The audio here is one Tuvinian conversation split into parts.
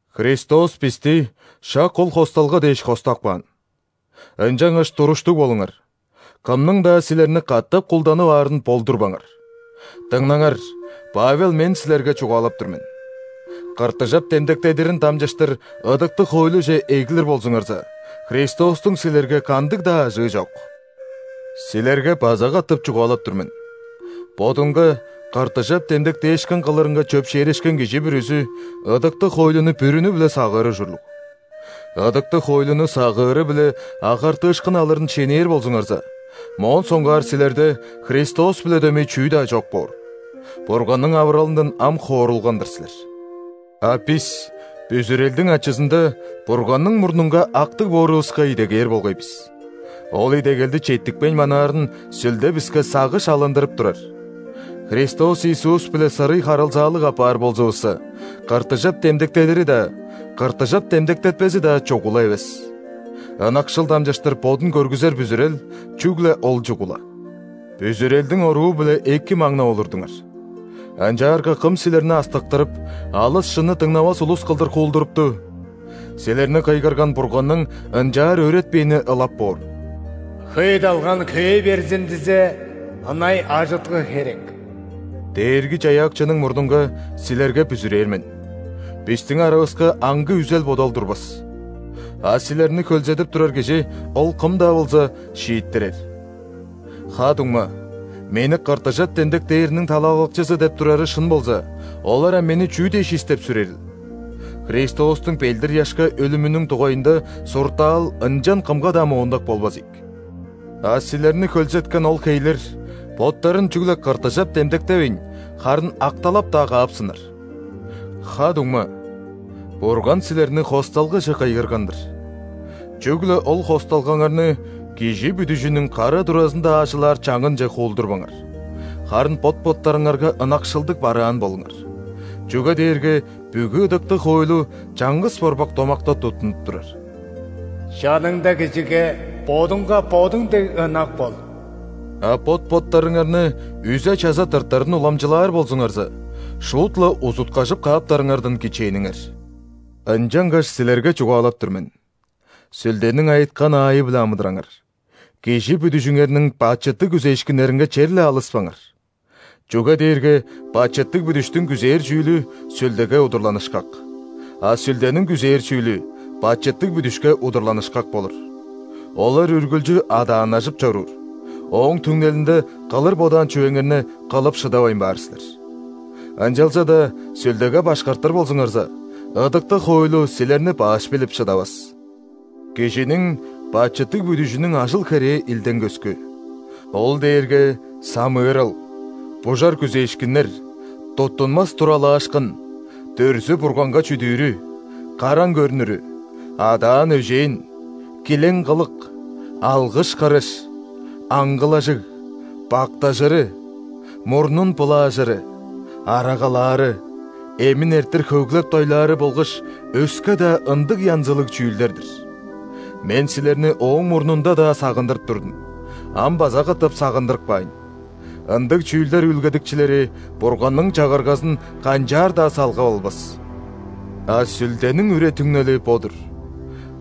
Христос бисти шак ол хосталга дээш хостап каан. Ынчангаш туруштуг болуңар, кымның-даа силерни катап кулданып аарын болдурбаңар. Дыңнаңар, Павел мен силерге чугаалап тур мен: ·кыртыжап демдектедирин дамчыштыр ыдыктыг хоойлуже эглир болзуңарза, Христостуң силерге кандыг-даа ажыы чок. Силерге база катап чугаалап тур мен: бодунга кыртыжап демдектээшкин кылырынга чөпшээрешкен кижи бүрүзү ыдыктыг хоойлуну бүрүнү-биле сагыыр ужурлуг. Ыдыктыг хоойлуну сагыыры-биле агартыышкын алырын шенээр болзуңарза, моон соңгаар силерде Христос-биле дөмей чүү-даа чок боор. Бурганның авыралындан ам хоорулган-дыр силер. А бис бүзүрелдиң ачызында Бурганның мурнунга актыг боорувуска идегээр болгай бис. Ол идегелди четтикпейн манаарын Сүлде биске сагыш алындырып турар. Христос Иисус-биле сырый харылзаалыг апаар болзувусса, ·кыртыжап демдектедири-даа, кыртыжап демдектетпези-даа чугула эвес. Ынакшыл дамчыштыр бодун көргүзер бүзүрел – чүгле ол чугула. Бүзүрелдиң оруу-биле эки маңнап олурдуңар. Ынчаарга кым силерни астыктырып, алыс шынны дыңнавас улус кылдыр хуулдурупту? Силерни кыйгырган Бурганның ынчаар өөретпээни ылап боор! «Хөй далган хөөй берзин дизе, ынай ажыткы херек». Дээрги-Чаяакчының мурнунга силерге бүзүрээр мен: бистиң аравыска аңгы үзел-бодал турбас. А силерни хөлзедип турар кижи, ол кым-даа болза, шииттирер. Ха-дуңма, мени ·кыртыжап демдектээриниң талалакчызы деп турары шын болза, олар ам мени чүү дээш истеп-сүрерил? Христостуң ·белдир-ыяшка өлүмүнүң дугайында суртаал ынчан кымга-даа моондак болбас ийик. А силерни хөлзеткен ол хейлер боттарын чүгле ·кыртыжап демдектевейн, харын ·акталап-даа каапсыннар! Ха-дуңма, Бурган силерни хосталгаже кыйгырган-дыр. Чүгле ол хосталгаңарны кижи бүдүжүнүң кара туразында аажылаар чаңынче хуулдурбаңар. Харын бот-боттарыңарга ынакшылдыг бараан болуңар. Чүге дээрге бүгү ыдыктыг хоойлу чаңгыс борбак домакта туттунуп турар: «Чаныңда кижиге бодуңга бодуң дег ынак бол». А бот-боттарыңарны үзе-чаза тыртарын уламчылаар болзуңарза, шуут-ла узуткажып кааптарыңардан кичээниңер. Ынчангаш силерге чугаалап тур мен: Сүлдениң айыткан аайы-биле амыдыраңар, кижи бүдүжүңерниң бачыттыг күзээшкиннеринге черле алыспаңар. Чүге дээрге бачыттыг бүдүштүң күзээр чүүлү Сүлдеге удурланышкак, а Сүлдениң күзээр чүүлү бачыттыг бүдүшке удурланышкак болур. Олар үргүлчү адааннажып чоруур, ооң түңнелинде кылыр бодаан чүвеңерни кылып шыдавайн баар силер. Ынчалза-даа Сүлдеге башкартыр болзуңарза, ыдыктыг хоойлу силерни баш билип шыдавас. Кижиниң бачыттыг бүдүжүнүң ажыл-херээ илдең көскү. Ол дээрге самыырал, бужар күзээшкиннер, туттунмас туралаашкын, дүрзү-бурганга чүдүүрү, караң көрнүрү, адаан-өжээн, килең-кылык, алгыш-кырыш, аңгылажыг, бактажыры, мурнун былаажыры, арагалаары, эмин эрттир хөглеп-дойлаары болгаш өске-даа ындыг янзылыг чүүлдер-дир. Мен силерни ооң мурнунда-даа сагындырып турдум, ам база катап сагындырып каайн: ындыг чүүлдер үүлгедикчилери Бурганның Чагыргазын канчаар-даа салгап албас. А Сүлдениң үре-түңнели бо-дур: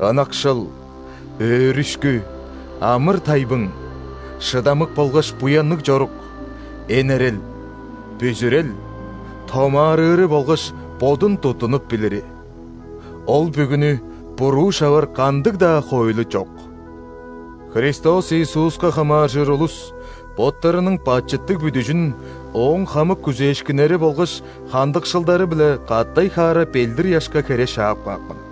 ынакшыл, өөрүшкү, амыр-тайбың, шыдамык болгаш буянныг чорук, энерел, бүзүрел, томаарыыры болгаш бодун туттунуп билири. Ол бүгүнү буруу шавар кандыг-даа хоойлу чок! Христос Иисуска хамааржыр улус боттарының бачыттыг бүдүжүн ооң хамык күзээшкиннери болгаш хандыкшылдары-биле катай-хаара ·белдир-ыяшка хере шаап каапкан.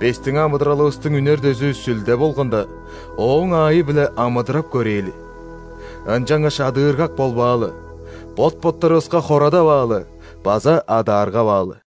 Бистиң амыдыралывыстың үнер дөзү Сүлде болганда, Ооң аайы-биле амыдырап көрээли! Ынчангаш адыыргак болбаалы, бот-боттарывыска хорадаваалы база адааргаваалы.